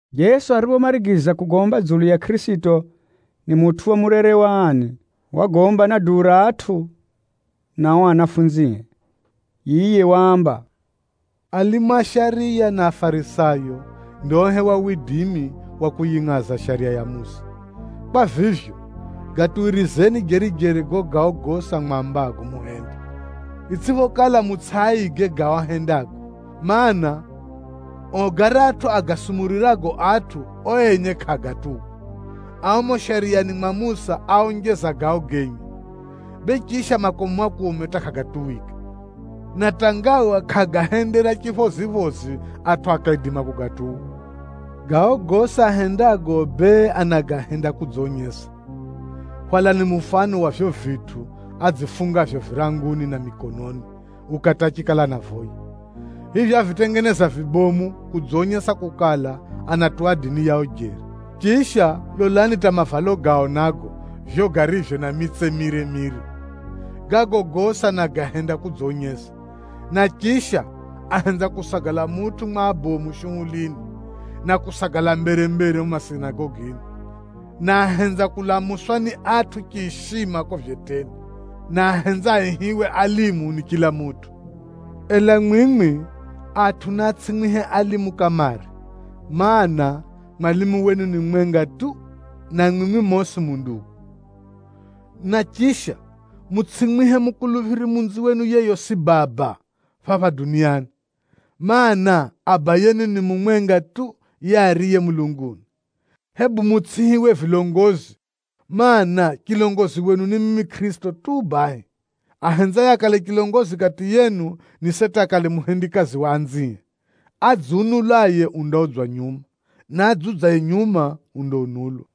Jeso ariphomarigiza kugomba dzulu ya Kʼirisito ni mutʼu wa murere wa ani, wagomba na duu ra atʼu na ao anafunzie. Yiye waamba, “Alimu a shariya na Afarisayo ndiohewa widimi wa kuyingʼaza Shariya ya Musa. Kwa vivyo, gatuwirizeni jeri-jeri gago gao gosi amwambago muhende, itsʼiphokala mutsʼiaige gao ahendago. Maana, ao garatʼu agasumurirago atʼu, ao enye kʼaagatuwa. Ao mumo Shariyani mwa Musa áonjeza gao genye, bee chisha makomu-makomu hata kʼagatuwika, na hata ngawa kʼaagahendera chiphoziphozi atʼu akaidima kugatuwa. Gao gosi ahendago bee, anagahenda kudzonyesa. Hwalani mufano wa vivyo vitʼu adzifungavyo viranguni na mikononi ukati achikala anavoya. Vivyo avitengeza vibomu kudzonyesa kukala, anatuwa dini yao jeri. Chisha, lolani hata mavalo gao nago vivyo garivyo na mitse mire-mire. Gago gosi anagahenda kudzonyesa. Na chisha, ahenza kusagala mutʼu mwa abomu shuhulini, na kusagala mbere-mbere mumo masinagogini. Na ahenza kulamuswa ni atʼu chiishima kuko vyeteni, na ahenza aihiwe, ‘Alimu’ ni chila mutʼu. Ela mwimwi, atʼu naatsʼimwihe ‘Alimu’ kamare, mana, mwalimu wenu ni mumwenga tu, na mwimwi mosi mu ndugu. Na chisha, mutsʼimwihe mukuluphiri munziwenu yeyosi ‘Baba’ phapha duniani, mana, Abayenu ni mumwenga tu yiye ariye mulunguni. Hebu mutsʼiihiwe ‘Vilongozi,’ mana, chilongozi wenu ni mimi Kʼirisito tu bahi. Ahenzaye akale chilongozi kati yenu, ni seti akale muhendikazi wa anzie. Adziunulaye undaudzwa nyuma, na adziudzaye nyuma undaunulwa.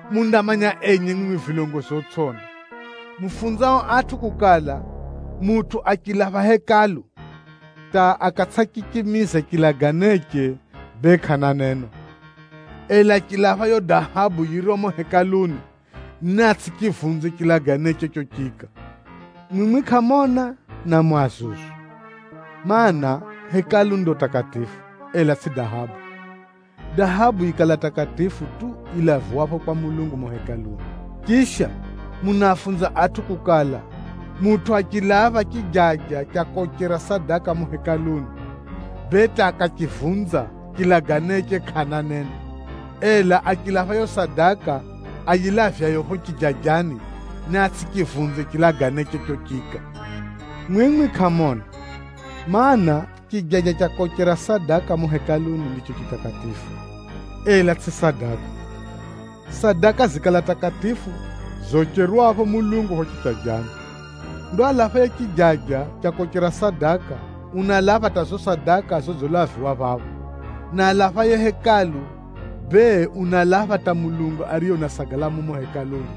“Mundamanya enye mwimwi vilongozi otsʼiona, mufunzao atʼu kukala, ‘Mutʼu achilapha Hekalu, hata akatsʼachichimiza chilaganeche bee kʼana neno. Ela achilapha yiyo dahabu yiriyo mumo Hekaluni, niatsʼichivunze chilaganeche chochiika.’ Mwimwi kʼamona, na mu azuzu! Maana, Hekalu ndo takatifu, ela tsʼi dahabu. Dahabu yikala takatifu tu yilaviwapho kwa Mulungu mumo Hekaluni. Chisha, munaafunza atʼu kukala, ‘Mutʼu achilapha chijaja cha kochera sadaka mumo Hekaluni, bee hata akachivunza chilaganeche kʼana neno. Ela achilapha yiyo sadaka ayilavyayo phapho chijajani, niatsʼichivunze chilaganeche chochiika.’ Mwimwi kʼamona! Maana, chijaja cha kochera sadaka mumo Hekaluni ndicho chitakatifu, ela tsʼi sadaka. Sadaka zikala takatifu zocherwapho Mulungu phapho chijajani. Ndo alaphaye chijaja cha kochera sadaka, unalapha hata zizo sadaka zodzilaviwa phapho. Na alaphaye Hekalu, bee unalapha hata Mulungu ariye unasagala mumo Hekaluni.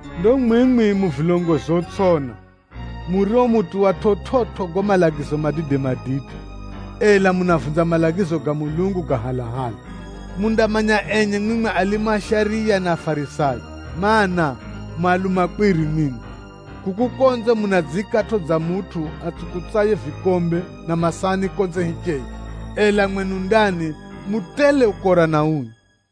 Ndo mwimwi mu vilongozi otsʼiona, murio mutuwa chividzo gago malagizo madide-madide, ela munavunza malagizo ga Mulungu ga halahala. “Mundamanya enye mwimwi alimu a shariya na Afarisayo, mana, mu alumakwiri! Mwimwi kuku konze munadziikatʼo dza mutʼu atsukutsaye vikombe na masahani konze hicheye, ela mwenu ndani, mu tele ukora na ui.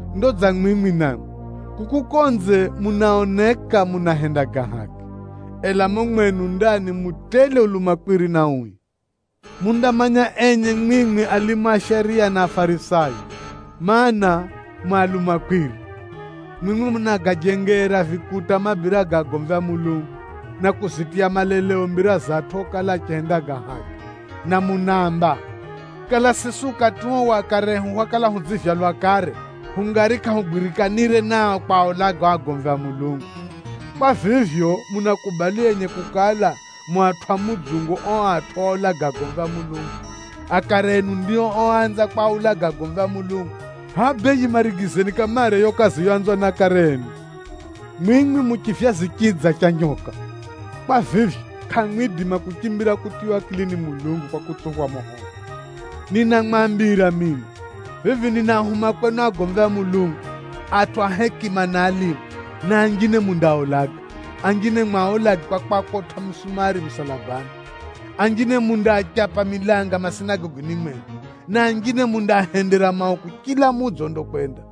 Ndo dza mwimwi namwi, kuku konze munaoneka munahenda ga haki, ela mumo mwenu ndani mu tele ulumakwiri na ui. “Mundamanya enye mwimwi alimu a shariya na Afarisayo, mana, mu alumakwiri! Mwimwi munagajengera vikuta mabira ga agomvi a Mulungu, na kuzitiya maleleo mbira za atʼu okala achihenda ga haki. Na munaamba, ‘Kala siswi ukati uo wa akare ehu hwakala hudzivyalwa kare, hungari kʼahugwirikanire nao kwaulaga ao agomvi a Mulungu!’ Kwa vivyo, munakubali enye kukala, mu atʼu a mudzungu a ao atʼu oulaga agomvi a Mulungu. Akare enu ndio oanza kwaulaga agomvi a Mulungu. Hʼaya bee yimarigizeni kamare yiyo kazi yoanzwa ni akare enu! Mwimwi mu chivyazi chii dza cha nyoka. Kwa vivyo, kʼamwidima kuchimbira kutiywa akili ni Mulungu kwa kutsuphwa moho wa Jahanamu. Ninamwambira mino, vivi ninaahuma kwenu agomvi a Mulungu, atʼu a hekima na alimu a shariya, na anjine mundaaulaga, anjine mwaulage kwa kwakotʼa misumari musalabani, anjine mundaachapa milanga masinagogini mwenu, na anjine mundaahendera mauku chila mudzi ondakwenda.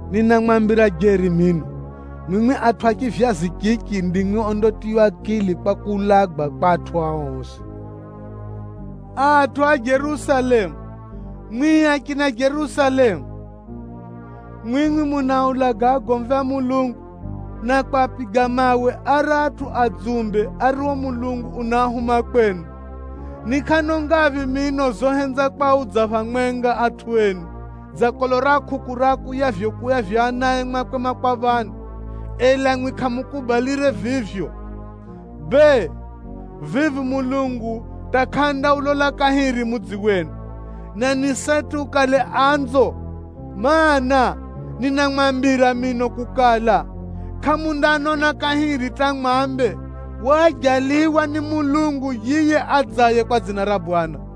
Ninamwambira jeri mino, mwimwi atʼu a chivyazi chichi ndimwi ondatiywa akili kwa kuulagwa kwa atʼu ao osi. “Atʼu a Jerusalemu! Mwimwi achina Jerusalemu, mwimwi munaaulaga agomvi a Mulungu, na kwapiga mawe aratʼu adzumbe ario Mulungu unaahuma kwenu! Ni kʼano ngaphi mino zohenza kwaudza phamwenga atʼu enu, dza kolo ra kʼukʼu riakuyakuyavyo anae mwakwe makwaphani, ela mwimwi kʼamukubalire vivyo. Bee, vivi Mulungu hata kʼandaulola kahiri mudzi wenu, na ni seti ukale anzo. Maana, ninamwambira mino kukala, kʼamundanona kahiri hata mwambe, ‘Waajaliwa ni Mwenyezi Mulungu yiye adzaye kwa dzina ra Bwana!’”